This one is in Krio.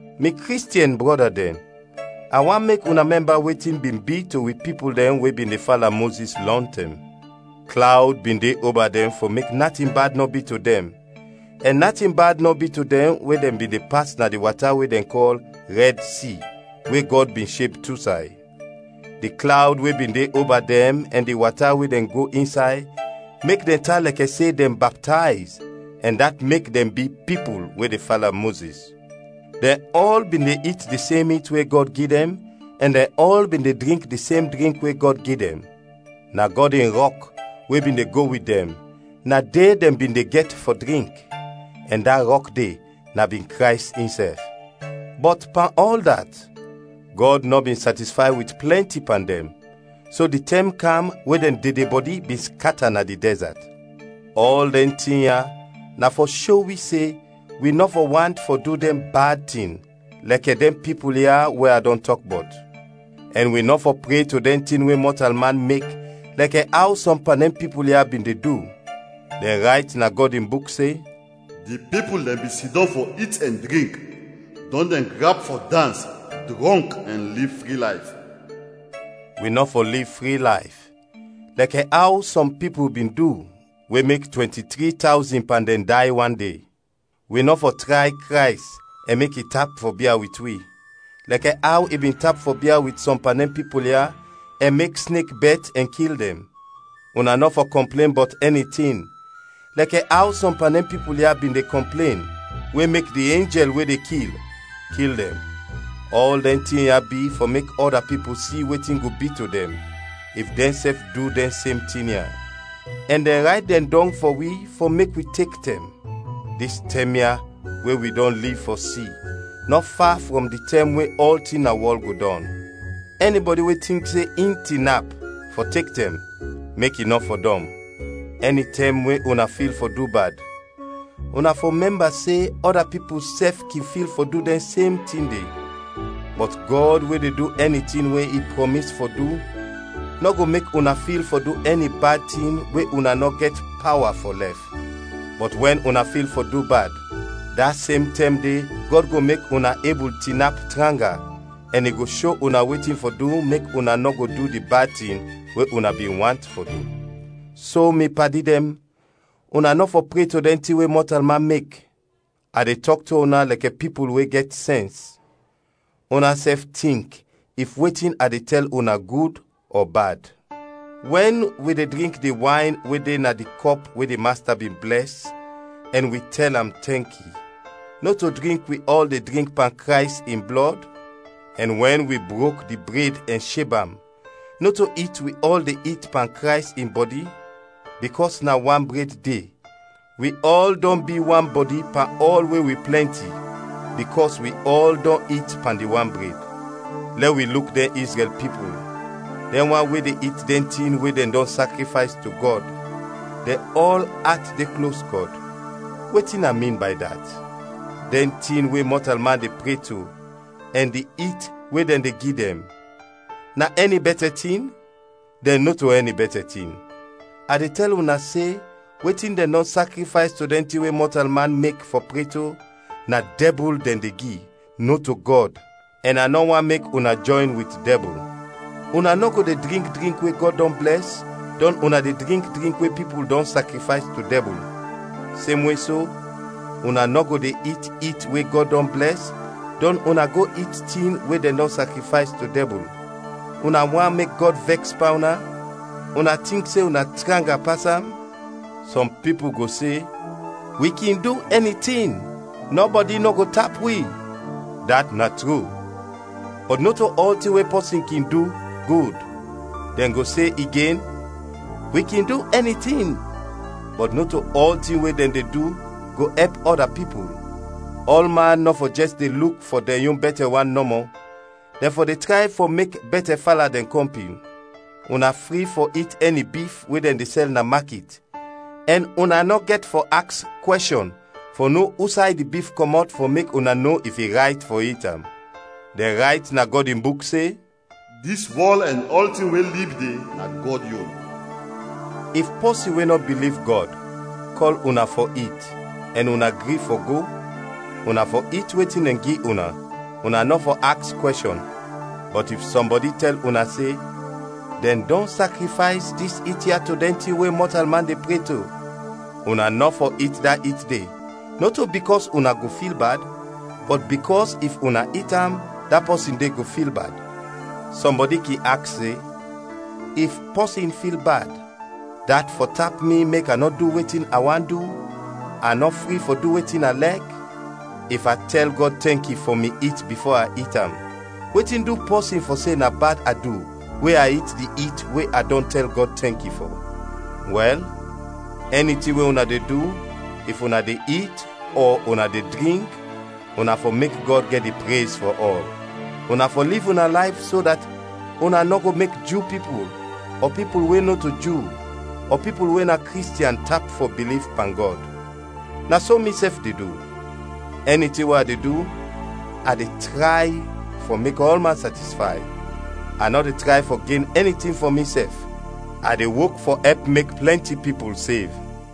Mi Kristiɛn brɔda dɛn, a want mek una mɛmba wetin bin bi to wi pipul dɛn we bin de fala Mozis lɔntɛm. Klawd bin de oba dɛn fɔ mek natin bad nɔ bi to dɛn, ɛn natin bad nɔ bi to dɛn wɛn dɛn bin de pas na di wata we dɛn kɔl Rɛd Si, we Gɔd bin sheb tu say. Di klawd we bin de oba dɛn ɛn di wata we dɛn go insay mek dɛn tan lɛkɛ se dɛn baptayz ɛn dat mek dɛn bi pipul we de fala Mozis. Dɛn ɔl bin de it di sem it we Gɔd gi dɛn, ɛn dɛn ɔl bin de drink di sem drink we Gɔd gi dɛn. Na Gɔd in rɔk we bin de go wit dɛn, na de dɛn bin de gɛt fɔ drink; ɛn da rɔk de na bin Krays insɛf. Bɔt pan ɔl dat, Gɔd nɔ bin satisfay wit plɛnti pan dɛn, so di tɛm kam we dɛn dedebɔdi bin skata na di dɛzat. Ɔl dɛn tin ya na fɔ sho wi se wi nɔ fɔ want fɔ du dɛn bad tin, lɛkɛ dɛn pipul ya we a dɔn tɔk bɔt. Ɛn wi nɔ fɔ pre to dɛn tin we mɔtalman mek lɛkɛ aw sɔm pan dɛn pipul ya bin de du. Dɛn rayt na Gɔd in Buk se, “Di pipul dɛn bin sidɔm fɔ it ɛn drink, dɔn dɛn grap fɔ dans, drɔnk ɛn liv fri layf.” Wi nɔ fɔ liv fri layf, lɛkɛ aw sɔm pipul bin du, we mek twɛnti-tri tawzin pan dɛn day wan de. Wi nɔ fɔ tray Krays ɛn mek i tap fɔ bia wit wi, lɛkɛ aw i bin tap fɔ bia wit sɔm pan dɛn pipul ya, ɛn mek snek bɛt ɛn kil dɛn. Una nɔ fɔ kɔmplen bɔt ɛni tin, lɛkɛ aw sɔm pan dɛn pipul ya bin de kɔmplen, we mek di enjɛl we de kil, kil dɛn. Ɔl dɛn tin ya bi fɔ mek ɔda pipul si wetin go bi to dɛn, if dɛnsɛf du dɛn sem tin ya; ɛn dɛn rayt dɛn dɔng fɔ wi fɔ mek wi tek tɛm. Dis tɛm ya we wi dɔn liv fɔ si nɔ fa frɔm di tɛm we ɔltin na wɔl go dɔn. Ɛnibɔdi we tink se in tinap, fɔ tek tɛm, mek i nɔ fɔdɔm. Ɛnitɛm we una fil fɔ du bad, una fɔ mɛmba se ɔda pipul sɛf kin fil fɔ du dɛn sem tin de. Bɔt Gɔd we de du ɛni tin we i prɔmis fɔ du, nɔ go mek una fil fɔ du ɛni bad tin we una nɔ go gɛt pawa fɔ lɛf; bɔt wɛn una fil fɔ du bad, da sem tɛm de Gɔd go mek una ebul tinap tranga ɛn i go sho una wetin fɔ du mek una nɔ go du di bad tin we una bin want fɔ du. So, mi padi dɛn, una nɔ fɔ pre to dɛn tin we mɔtalman mek. A de tɔk to una lɛkɛ pipul we gɛt sɛns; unasɛf tink if wetin a de tɛl una gud ɔ bad. Wɛn wi de drink di wayn we de na di kɔp we di Masta bin blɛs ɛn wi tɛl am tɛnki: nɔto drink wi ɔl de drink pan Krays in blɔd? Ɛn wɛn wi brok di bred ɛn sheb am, nɔto it wi ɔl de it pan Krays in bɔdi? Bikɔs na wan bred de, wi ɔl dɔn bi wan bɔdi pan ɔl we wi plɛnti, bikɔs wi ɔl dɔn it pan di wan bred. Lɛ wi luk dɛn Izrɛl pipul; dɛn wan we de it dɛn tin we dɛn dɔn sakrifays to Gɔd, dɛn ɔl at de klos Gɔd. Wetin a min bay dat? Dɛn tin we mɔtalman de pre to ɛn di it we dɛn de gi dɛn, na ɛni bɛtɛ tin? Dɛn nɔto ɛni bɛtɛ tin. A de tɛl una se wetin dɛn dɔn sakrifays to dɛn tin we mɔtalman mek fɔ pre to, na dɛbul dɛn de gi, nɔto Gɔd, ɛn a nɔ want mek una jɔyn wit dɛbul. Una nɔ go de drink drink we Gɔd dɔn blɛs, dɔn una de drink drink we pipul dɔn sakrifays to dɛbul. Semwe so, una nɔ go de it it we Gɔd dɔn blɛs, dɔn una go it tin we dɛn dɔn sakrifays to dɛbul. Una want mek Gɔd vɛks pan una? Una tink se una tranga pas am? Sɔm pipul go se, “Wi kin du ɛni tin, nɔbɔdi nɔ go tap wi.” Dat na tru. Bɔt nɔto ɔltin we pɔsin kin du, gud. Dɛn go se igen, “Wi kin du ɛni tin,” bɔt nɔto ɔltin we dɛn de du, go ɛp ɔda pipul. Ɔlman nɔ fɔ jɛs de luk fɔ dɛn yon bɛtɛ wan nɔmɔ, dɛn fɔ de tray fɔ mek bɛtɛ fala dɛn kɔmpin. Una fri fɔ it ɛni bif we dɛn de sɛl na makit ɛn una nɔ gɛt fɔ aks kwɛshɔn fɔ no usay di bif kɔmɔt fɔ mek una no if i rayt fɔ it am. Dɛn rayt na Gɔd in Buk se, “Dis wɔl ɛn ɔltin we lib de na Gɔd yon.” If pɔsin we nɔ biliv Gɔd, kɔl una fɔ it, ɛn una gri fɔ go, una fɔ it wetin dɛn gi una, una nɔ fɔ aks kwɛshɔn. Bɔt if sɔmbɔdi tɛl una se, “Dɛn dɔn sakrifays dis it ya to dɛn tin we mɔtalman de pre to,” una nɔ fɔ it da it de, nɔto bikɔs una go fil bad, bɔt bikɔs if una it am, da pɔsin de go fil bad. Sɔmbɔdi kin aks se, “If pɔsin fil bad, dat fɔ tap mi mek a nɔ du wetin a want du, a nɔ fri fɔ du wetin a lɛk? If a tɛl Gɔd tɛnki fɔ mi it bifo a it am, wetin du pɔsin fɔ se na bad a du we a it di it we a dɔn tɛl Gɔd tɛnki fɔ?” Wɛl, ɛni tin we una de du, if una de it ɔ una de drink, una fɔ mek Gɔd gɛt di prez fɔ ɔl. Una fɔ liv una layf so dat una nɔ go mek Ju pipul, ɔ pipul we nɔto Ju, ɔ pipul we na Kristiɛn tap fɔ biliv pan Gɔd. Na so misɛf de du; ɛni tin we a de du, a de tray fɔ mek ɔlman satisfay, a nɔ de tray fɔ gen ɛni tin fɔ misɛf, a de wok fɔ ɛp mek plɛnti pipul sev.